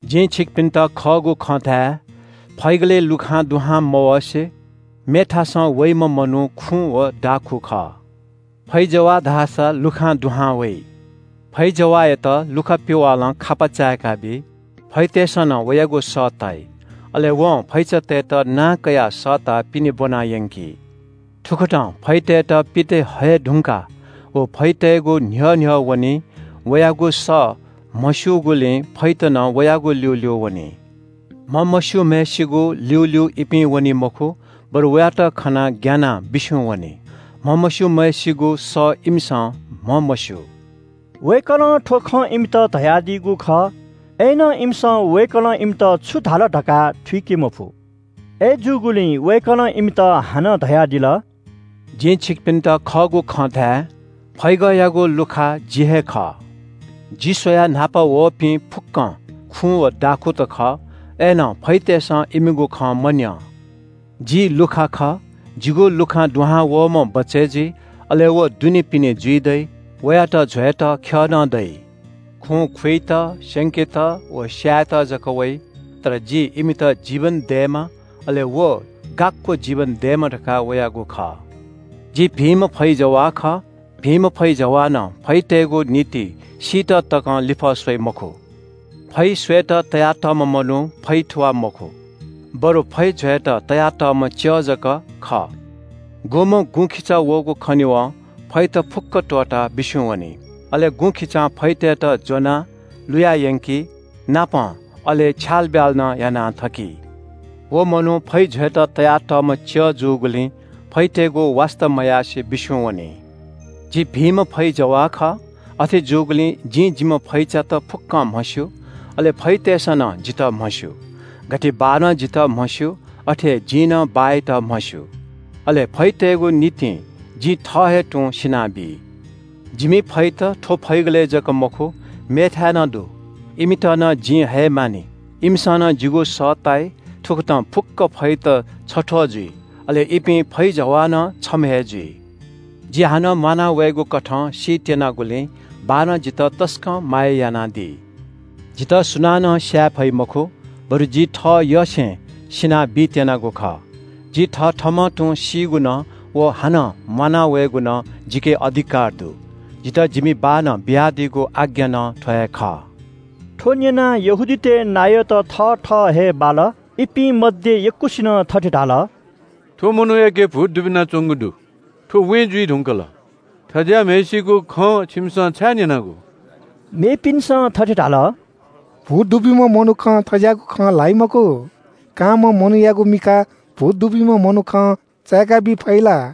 “जिं छिकपिन्‍त खःगु खँ धाये – फैगलय् लुखां दुहां मवसे मेथासं वइम्‍ह मनू खुँ व दाखुँ खः। फैजवाः धाःसा लुखां दुहां वइ। फैजवाःयात लुखा पिवालं खापा चाय्‌काबी। फैतय्‌सं नं वयागु सः ताइ। अले वं फैचातय्‌त नां कयाः सःताः पिने ब्‍वना यंकी। थुकथं फैतय्‌त पित हये धुंकाः व फैतय्‌गु न्‍ह्यः न्‍ह्यः वनी। वयागु सः म्‍हस्‍यूगुलिं फैत नं वयागु ल्‍यूल्‍यू वनी। म्‍हमस्‍यूम्‍हय्‌सिगु ल्‍यूल्‍यू इपिं वनी मखु, बरु वयात खनाः ग्‍यानाः बिस्‍युं वनी। म्‍हमस्‍यूम्‍हय्‌सिगु सः इमिसं म्‍हमस्‍यू।” वय्‌कलं थ्‍व खँ इमित धयादीगु खः। अय्‌नं इमिसं वय्‌कलं इमित छु धाल धकाः थुइके मफु। अय्‌जूगुलिं वय्‌कलं इमित हानं धयादिल – “जिं छिकपिन्‍त खःगु खँ धाये – फैगःयागु लुखा जि हे खः। जि स्‍वयाः न्‍हापा वःपिं फुक्‍कं खुँ व दाखुँत खः। अय्‌नं फैतय्‌सं इमिगु खँ मन्‍यं। जि लुखा खः। जिगु लुखां दुहां वःम्‍ह बचय् जुइ, अले व दुनेपिने जुइ दइ, वयात ज्‍वयेत ख्‍यः नं दइ। खुँ खुइत, स्‍यंकेत व स्‍यायेत जक वइ। तर जि इमित जीवन दयेमा, अले व यक्‍व जीवन दयेमा धकाः वयागु खः। “जि भिंम्‍ह फैजवाः खः। भिंम्‍ह फैजवालं फैतय्‌गु निंतिं सीत तकं लिफः स्‍वइ मखु। फै स्‍वयेत तयातःम्‍ह मनू फैथुवाः मखु, बरु फै ज्‍वयेत तयातःम्‍ह च्‍यः जक खः, गुम्‍ह गुँखिचा वःगु खनेवं फैत फुक्‍क त्‍वःताः बिस्‍युं वनी। अले गुँखिचां फैतय्‌त ज्‍वनाः लुया यंकी, अले छ्यालब्‍याल नं याना थकी। व मनू फै ज्‍वयेत तयातःम्‍ह च्‍यः जूगुलिं फैतय्‌गु वास्‍ता मयासें बिस्‍युं वनी। “जि भिंम्‍ह फैजवाः खः। अथे जूगुलिं जिं जिम्‍ह फैचात फुक्‍कं म्‍हस्‍यू, अले फैतय्‌सं नं जितः म्‍हस्‍यू। गथे बाःनं जितः म्‍हस्‍यू, अथे हे जिं नं बाःयात म्‍हस्‍यू। अले फैतय्‌गु निंतिं जि थः हे तुं सिना बी। जिमि फैत थ्‍व फैगलय् जक मखु, मेथाय् नं दु। इमित नं जिं हयेमानि। इमिसं नं जिगु सः ताइ। थुकथं फुक्‍क फैत छथ्‍वः जुइ, अले इमि फैजवाः नं छम्‍ह हे जुइ। “जि हानं म्‍वाना वयेगु कथं सी त्‍यनागुलिं बाःनं जितः तसकं माया यानादी। जितः सुनानं स्‍याये फइ मखु, बरु जि थःयसें सिना बीत्‍यनागु खः। जि थथःम्‍हं तुं सीगु नं व हानं म्‍वाना वयेगु नं जिके अधिकार दु। जितः जिमि बाःनं बियादीगु आज्ञा नं थ्‍व हे खः।” थ्‍व न्‍यनाः यहूदीतय् नायःत थथः हे बाल। इपिं मध्‍ये यक्‍वसिनं थथे धाल – “थ्‍व मनूयाके भूत दुबिनाच्‍वंगु दु। थ्‍व वें जुइ धुंकल। थज्‍याःम्‍हय्‌सिगु खँ छिमिसं छाय् न्‍यनागु?” मेपिन्‍सं थथे धाल – “भूत दुब्‍यूम्‍ह मनुखं थज्‍याःगु खँ ल्‍हाइ मखु। कांम्‍ह मनूयागु मिखा भूत दुब्‍यूम्‍ह मनुखं चाय्‌काबी फइ ला?”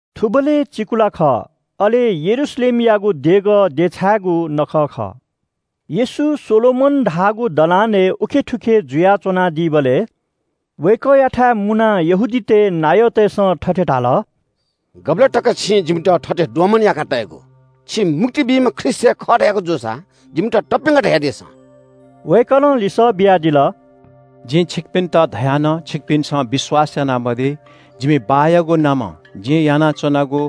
थुबलय् चिकुला खः। अले यरूशलेमयागु देगः देछाय्‌गु नखः खः। येशू सोलोमन धाःगु दलानय् थुखे उखे जुयाच्‍वनादीबलय् वय्‌कःयाथाय् मुनाः यहूदीतय् नायःतय्‌सं थथे धाल – “गुबलय् तक छिं जिमित थथे दोमन याका तयेगु? छि मुक्ति बीम्‍ह ख्रीष्‍ट हे खः धयागु जूसा जिमित तप्‍यंक धयादिसँ।” वय्‌कलं लिसः बियादिल – “जिं छिकपिन्‍त धया नं छिकपिन्‍सं विश्‍वास यानामदी। जिमि बाःयागु नामं जिं यानाच्‍वनागु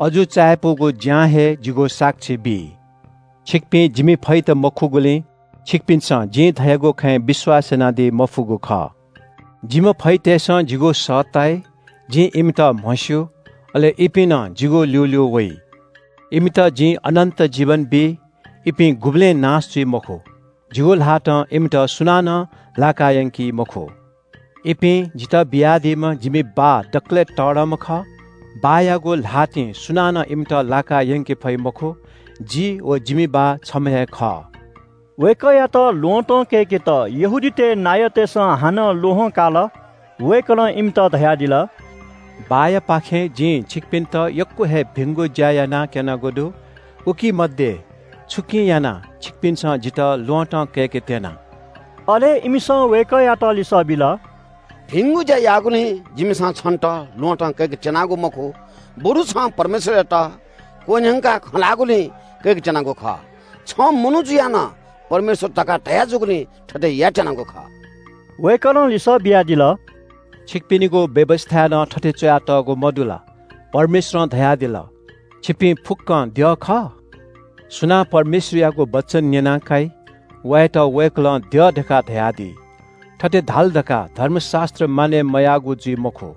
अजू चायापुगु ज्‍यां हे जिगु साक्षी बी। छिकपिं जिमि फैत मखुगुलिं छिकपिन्‍सं जिं धयागु खँय् विश्‍वास यानादी मफुगु खः। जिम्‍ह फैतय्‌सं जिगु सः ताइ, जिं इमित म्‍हस्‍यू, अले इपिं नं जिगु ल्‍यूल्‍यू वइ। इमित जिं अनन्‍त जीवन बी। इपिं गुबलें नाश जुइ मखु। जिगु ल्‍हातं इमित सुनानं लाकायंकी मखु। इपिं जितः बियादीम्‍ह जिमि बाः दकलय् तःधंम्‍ह खः। बाःयागु ल्‍हातिं सुनानं इमित लाकायंके फइ मखु। जि व जिम्‍ह बाः छम्‍ह हे खः।” वय्‌कःयात ल्‍वहँतं कय्‌केत यहूदीतय् नायःतय्‌सं हानं ल्‍वहं काल। वय्‌कलं इमित धयादिल – “बाःयापाखें जिं छिकपिन्‍त यक्‍व हे भिंगु ज्‍या यानाः क्‍यनागु दु, उकी मध्‍ये छुकिं यानाः छिकपिन्‍सं जितः ल्‍वहँतं कय्‌केत्‍यना?” अले इमिसं वय्‌कःयात लिसः बिल – “भिंगु ज्‍या याःगुलिं जिमिसं छन्‍त ल्‍वहँतं कय्‌केत्‍यनागु मखु, बरु छं परमेश्‍वरयात क्‍वह्यंकाः खँ ल्‍हाःगुलिं कय्‌केत्‍यनागु खः। छं मनू जुयाः नं परमेश्‍वर धकाः धया जूगुलिं थथे यायेत्‍यनागु खः।” वय्‌कलं लिसः बियादिल – “छिकपिनिगु व्‍यवस्‍थाय् नं थथे च्‍वयातःगु, मदु ला– ‘परमेश्‍वरं धयादिल – “छिपिं फुक्‍कं द्यः खः?”’ सुनां परमेश्‍वरयागु वचन न्‍यना काइ, वयात वय्‌कलं द्यः धकाः धयादी। थथे धाल धकाः धर्मशास्‍त्र मानय् मयाःगु जुइ मखु।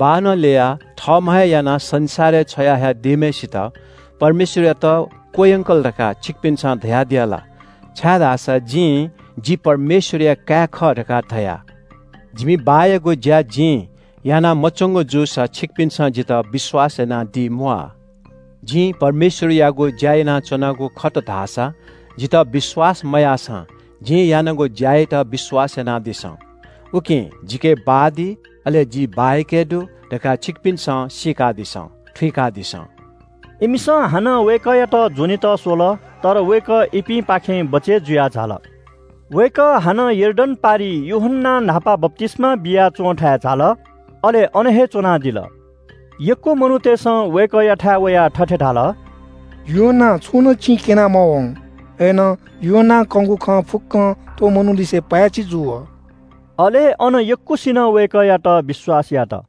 बाःनं ल्‍ययाः थःम्‍ह हे यानाः संसारय् छ्वया हयादीम्‍हय्‌सित परमेश्‍वरयात क्‍वह्यंकल धकाः छिकपिन्‍सं धयादीया ला, छाय्‌धाःसा जिं ‘जि परमेश्‍वरया काय् खः’ धकाः धया? जिमि बाःयागु ज्‍या जिं याना मच्‍वंगु जूसा छिकपिन्‍सं जितः विश्‍वास यानादीम्‍वाः। जिं परमेश्‍वरयागु ज्‍या यानाच्‍वनागु दुसा जितः विश्‍वास मयाःसां जिं यानागु ज्‍या यात विश्‍वास यानादिसँ। उकिं जिके बाः दी, अले जि बाःयाके दु धकाः छिकपिन्‍सं सीकादिसँ, थुइकादिसँ।” इमिसं हानं वय्‌कःयात ज्‍वनेत स्‍वल। तर वय्‌कः इपिंपाखें बचय् जुयाः झाल। वय्‌कः हानं यर्दन पारिइ यूहन्‍नां न्‍हापा बप्‍तिस्‍मा बिया च्‍वंथाय् झाल, अले अन हे च्‍वनादिल। यक्‍व मनूतय्‌सं वय्‌कःयाथाय् वयाः थथे धाल – “यूहन्‍नां छुं नं चिं क्‍यना मवं, अय्‌नं यूहन्‍नां कंगु खँ फुक्‍कं थ्‍व मनूलिसे पाय्‌छि जू वः।” अले अन यक्‍वसिनं वय्‌कःयात विश्‍वास यात।